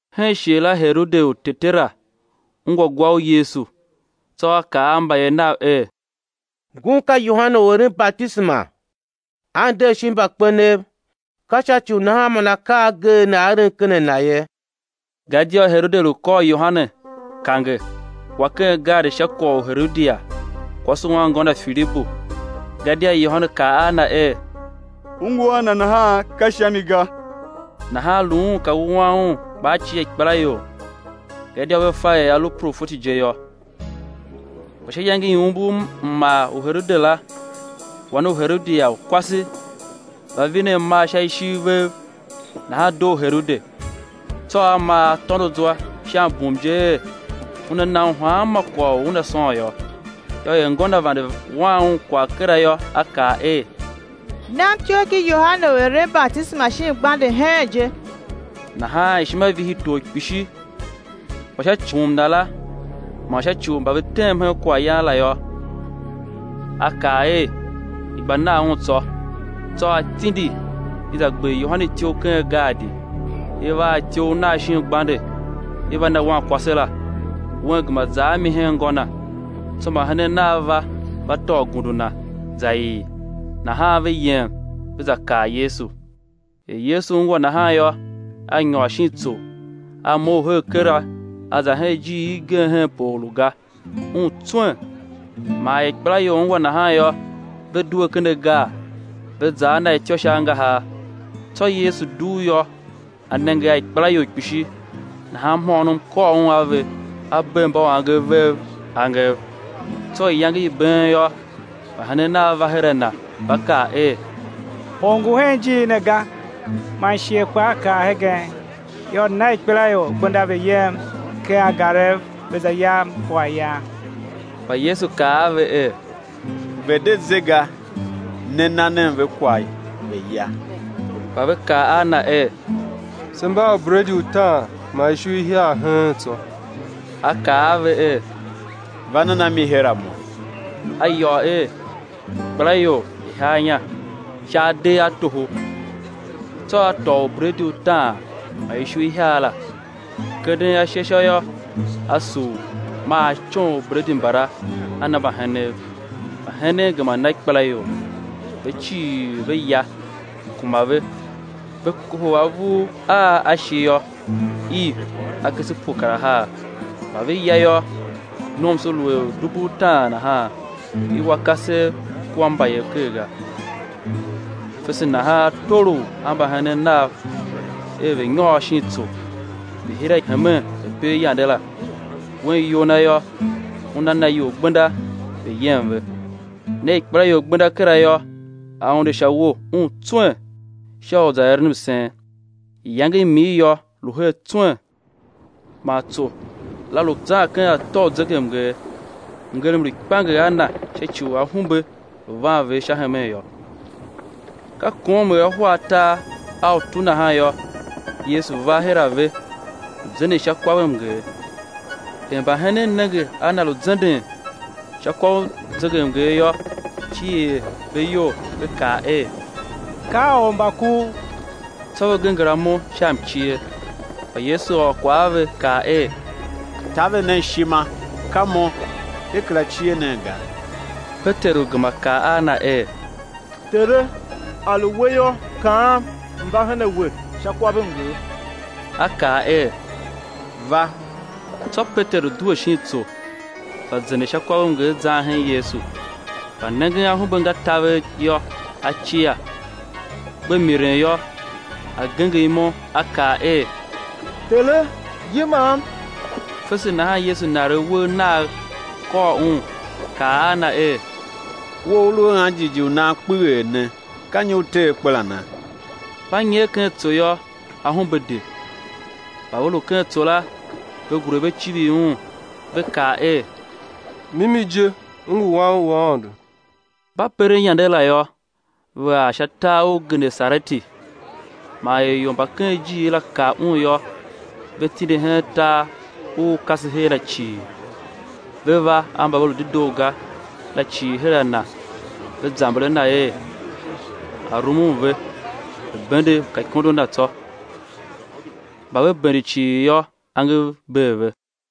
Hen shighe la Herode u tetera ungwa gwa u Yesu. Tsô a kaa a mbayev nav er: Ngun ka Yohane u eren batisema; a nder shin mbakpenev, ka sha ci u nahan man akaa a ageegh ne a eren ken a Na ye. Gadia Herode lu kôr Yohane, kange, wa ken gaadi sha kwagh u Herodia, kwase u anngô na Filibu. Gadia Yohane kaa a na er: U ngu a na nahan ka sha mi ga. Nahan lu un ka wuan un kpa a cia ikpelaior, gadia ve fa er a lu profeti je yô. Kpa sha iyange i umbur mmar u Herode la, wan u Herodia u kwase va vine amar sha ishiv vev, nahan doo Herode. Tsô a maa a tôndo zwa sha mbum je er, una na un hanma kwagh u una sôn yô. Yô, er ngô na vande wan un kwagh kera yô, a kaa er: Nam ityough ki Yohane u eren batisema shin gbande heen je. Nahan ishima vihi tor kpishi; kpa sha ci u mbum na la, man sha ci u mba ve tem hen kwaghyan la yô, a kaa er, i̱ gba nan un tsô. Tsô a tindi, i za gber Yohane ityough ken gaadi. I va a ityough nagh shin gbande, i va na wankwase la; wen gema za a mi hen ngô na. Tsô mbahenen nav va, va tôô gundu na, za ii, nahan ve yem ve za kaa Yesu. Er Yesu ungwa nahan yô, A nyôr shin tsô, A mough her kera A za hen ijir igen henpe or lu ga, Un tswen. Man er ikpelaior ungwa nahan yô, ve due ken agar, ve za a Na ityô sha angahar. Tsô Yesu dugh yô, A nenge a ikpelaior kpishi; nahan mhôônom kôr Un a ve, A bee mbauangev vev angev. Tsô iyange i been yô, mbahenen Nav va her a Na, va kaa er: Or ngu hen ijiir ne ga, man shighe kpaa kar hegen; yô, na ikpelaior gbenda ve yem ken angarev ve za yam kwaghyan. Kpa Yesu kaa a ve er: Ve̱ de ze ga; ne, na nen ve kwagh ve̱ ya. Kpa ve kaa a Na er: Se mba a ubredi utaan man ishu ihiar heen tsô. A kaa a ve er: Va nen a mi her a Mo. A yôô er, ikpelaior i̱ haa inya sha adeghatoho. Tsô a A tôô ubredi utaan man ishu ihiar la, kenden ashe sha yô, A sugh, maa A coon ubredi mbala A na mbahenen, mbahenen gema na ikpelaior. Ve cii ve ya, kuma ve; ve kohol avur a a shi yô, iv akese pue kar ahar. Mba ve ya yô, nomso lu er dubu utaan nahan, i wa kasev kua mbayev ker ga. Fese nahan a tolough a mbahenen Nav er ve̱ nyôr shin tsô, ve̱ hira hemen ve̱ per yande la; Wen iyol Na yô, Una na ior gbenda ve̱ yem ve. Ne ikpelaior gbenda kera yô, A unde sha uwo, Un tswen, sha u za eren msen. Iyange i mir yô, lu her tswen. Man tso la lu zan ken atô u zegemnger, mngerem lu kpianger a na sha ci u ahumbe lu van ve sha hemen yô. Ka kom er ahwa atar a utu nahan yô, Yesu va her a ve, lu zenden sha kwavmnger. Er mbahenen nenge a Na lu zenden sha kwav u zegemnger yô, cier ve iyol, ve kaa er: Ka ormbakuv! Tsô ve genger amo sha mcie. Kpa Yesu ôr kwagh a ve, kaa er: Taver nen ishima, ka Mo, de kera cie nen ga. Peteru gema kaa a Na er: Tere, a lu We yô, kaam m̱ va her a We sha kwavmnger. A kaa er: Va! Tsô Peteru due shin tsô, gba zenden sha kwavmnger zan hen Yesu. Kpa nengen ahumbe nga taver yô, a cia; gbe miren yô, a genger imo, a kaa er: Tere, yimam! Fese nahan Yesu naregh uwegh Nagh, kôr un, kaa a na er: We u u lu a anjighjigh u nan kpeghee ne, ka nyi u te akperana? Mba nyer ken tso yô, ahumbe de. Mba ve lu ken tso la, ve gure ve civir Un, ve kaa er: Mimi je U ngu Wan u Aôndo. Mba peren yande la yô, ve ar sha tar u Genesareti. Man er ior mba ken ijiir la kav Un yô, ve tindi hen tar u u kase her la cii ve va a mba ve lu dedoo ga la cii her a Na. Ve zamber a Na er, A̱ rumun ve, ve̱ bende mkaikondo Na tsô. Mba ve bende cii yô, angev bee ve.